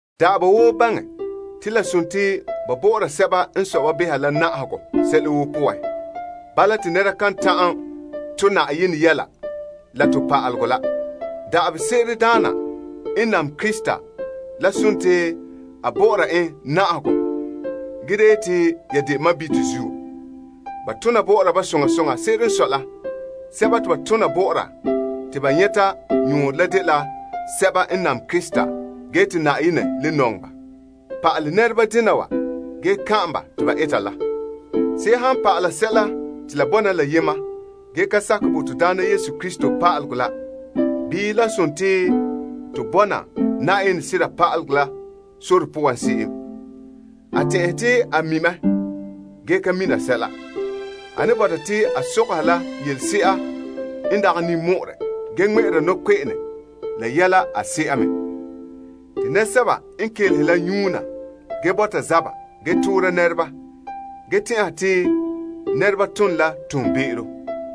Da'aba woo baŋɛ te la dela ba bɔ'ɔra sɛba n sɔe ba la na'ahegɔ sɛla woo poan. Bala te nɛra kan ta'an to' Yenɛ yu'urɛ la to pa'alegɔ la. Da'aba woo tona bɔ'ɔra daana n nam Krista, la dela a bɔ'ɔra en na'ahegɔ ge da yeti ya de sɔɔnrɔ zuo. Ba tona bɔ'ɔra ba soŋa soŋa. Se'ere n sɔe la, sɛba te ba tona bɔ'ɔra te ba nyɛta yɔɔrɔ la dela sɛba n nam Krista te nɔŋɛ ba. Pa'alɛ nɛreba dena wa ge kan'ana ba te ba eta la. Se'em han pa'ala sɛla te la bɔna la yema ge ka sakɛ bo to Daana Yesu Krista yelehom la bii lan dela to bɔna pa'alegɔ la Yenɛ sore poan se'em, a tɛn'ɛhe te a mi' mɛ ge ka mina sɛla. A ne bɔta te a sɔgɔha la yelese'a n dagɛ ninmɔ'ɔrɛ ge ŋmɛ'ɛra nɔkpe'ene yɛla a se'a me. Te nɛresɛba n kelehe la nyuuna ge bɔta zaba ge toora nɛreba ge tɛn'ɛha te nɛreba tone la be'em.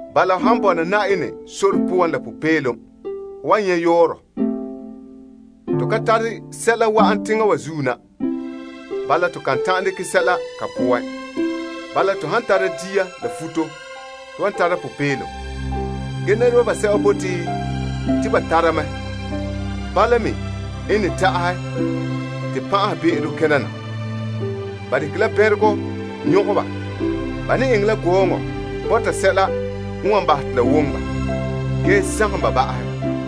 Bala, ho han bɔna Na'ayenɛ sore poan la popeelom, ho wan nyɛ' yɔɔrɔ. Se'ere n sɔe to ka tare sɛla wa'an teŋa wa zuo na bala to kan ta'an dekɛ sɛla ka poan. Bala, to han tara dia la futo, to wan tara popeelom. Ge nɛreba basɛba bote te ba tara mɛ, bala me n ne ta'ahɛ te pan'abe'ero kena na la bɛnregɔ nyɔgɛ ba. Ba ne eŋɛ la gɔɔnɛ bɔta sɛla n wan bahɛ te la woŋɛ ba ge sagom ba ba'ahɛ,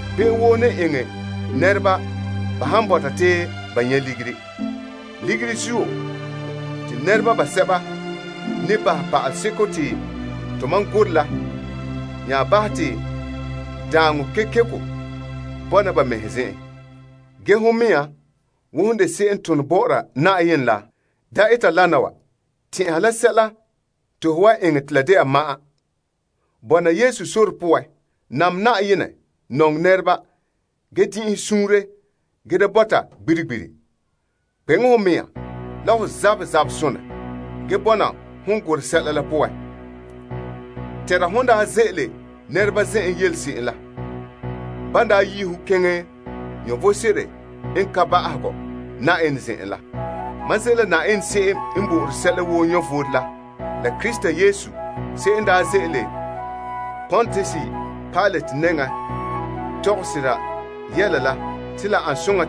Be'em woo ne eŋɛ nɛreba ba han bɔta te ba nyɛ' ligiri. Ligiri zuo, te nɛreba basɛba ne bahɛ sera pa'alegɔ te tomam gorɛ la nya bahɛ te daaŋɔ kekeko bɔna ba mɛhe zen'en. Ge hon mɛŋa, wo hon de se'em n tone bɔ'ɔra Yenɛ la, da eta dena wa. Tɛn'ɛha tontɔɔ vom ma'an. Bɔna Yesu sore poan, nam Yenɛ, nɔŋɛ nɛreba, ge din'inhe suunre ge da bɔta gbiri gbiri. Kpeŋe ho mɛŋa la ho zabɛ zabe sonɛ ge bɔna hon gorɛ sera pa'alegɔ la poan. Tɛnra hon daa ze'ele nɛreba zen'en yele se'em la, ban daa yi' ho keŋɛ vom sebo n ka ba'ahegɔ Yenɛ zen'en la. Mam ze' la Yenɛ se'em n bo'ore sɛla woo vom la la Krista Yesu se'em n daa ze'ele Pontius Pilate nɛŋan tɔgɛ sera yɛla la a nɛŋa yɛta kɔ te la ane soŋa,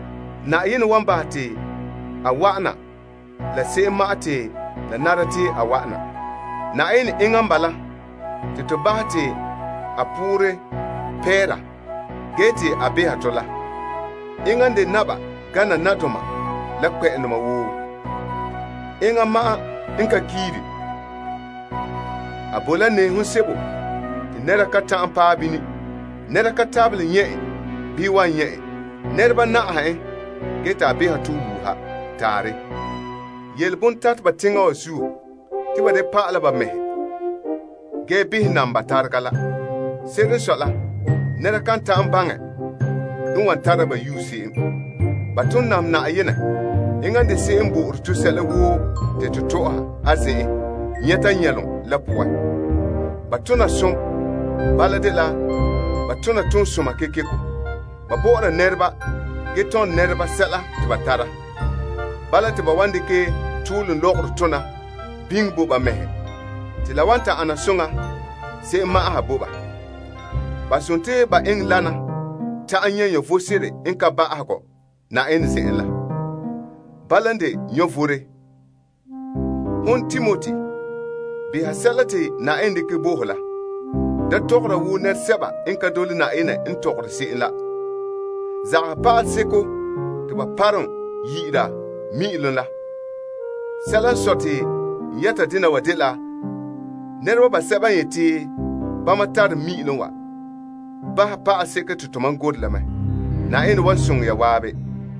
Yenɛ wan bahɛ te a wa'ana la se'em ma'an te la nara te a wa'ana. Yenɛ enŋa n bala te nɛreba pɛngera la ge te a sɔna sɛla woo la, to baha te a poorɛ pɛɛra ge te a beha tɔ la. Enŋa n de naba gana nadoma la kpɛma woo. Enŋa ma'an n ka kiiri. A bo la nɛɛhom sebo te nɛra ka ta'an paɛ bini. Nɛra ka tabelɛ nyɛ' en bii wan nyɛ' en. Nɛreba na'aha en ge te a beha tɔ wuuha. Taarɛ. Yele bontateba teŋa wa zuo te ba da pa'ala ba mɛhe ge behɛ nam ba tarega la. Se'ere n sɔe la, nɛra kan ta'an baŋɛ n wan tara ba yue se'em. Ba ton nam Yenɛ. Enŋa n de se'em n bo'ore to sɛla woo te to tɔ'ɔha a zen'en nyɛta nyɛlom la poan. Ba tona som, bala dela ba tona toonsoma kekeko. Ba bɔ'ɔra nɛreba ge tɔnrɛ nɛreba sɛla te ba tara. Bala te ba wan dekɛ toolom lɔgɔrɔ tona biŋe bo ba mɛhe te la wan ta ana soŋa se'em ma'an ha bo ba. Ba sontii ba eŋɛ dena ta'an nyɛ' vom sebo n ka ba'ahegɔ Yenɛ zen'en la. Bala n de vom. Hon Timoti, beha sɛla te Yenɛ dekɛ bo ho la. Da tɔgɔra wo nɛresɛba n ka dole Yenɛ n tɔgɔre se'em la. Zagahɛ pa'aleseko te ba parom yi'ira yam la. Sɛla n sɔe te n yɛta dena wa dela nɛreba basɛba yeti bama tare yam te la bahɛ pa'aleseko te tomam gorɛ la mɛ. Yenɛ zo'ohogɔ bɔna la ya zan'an.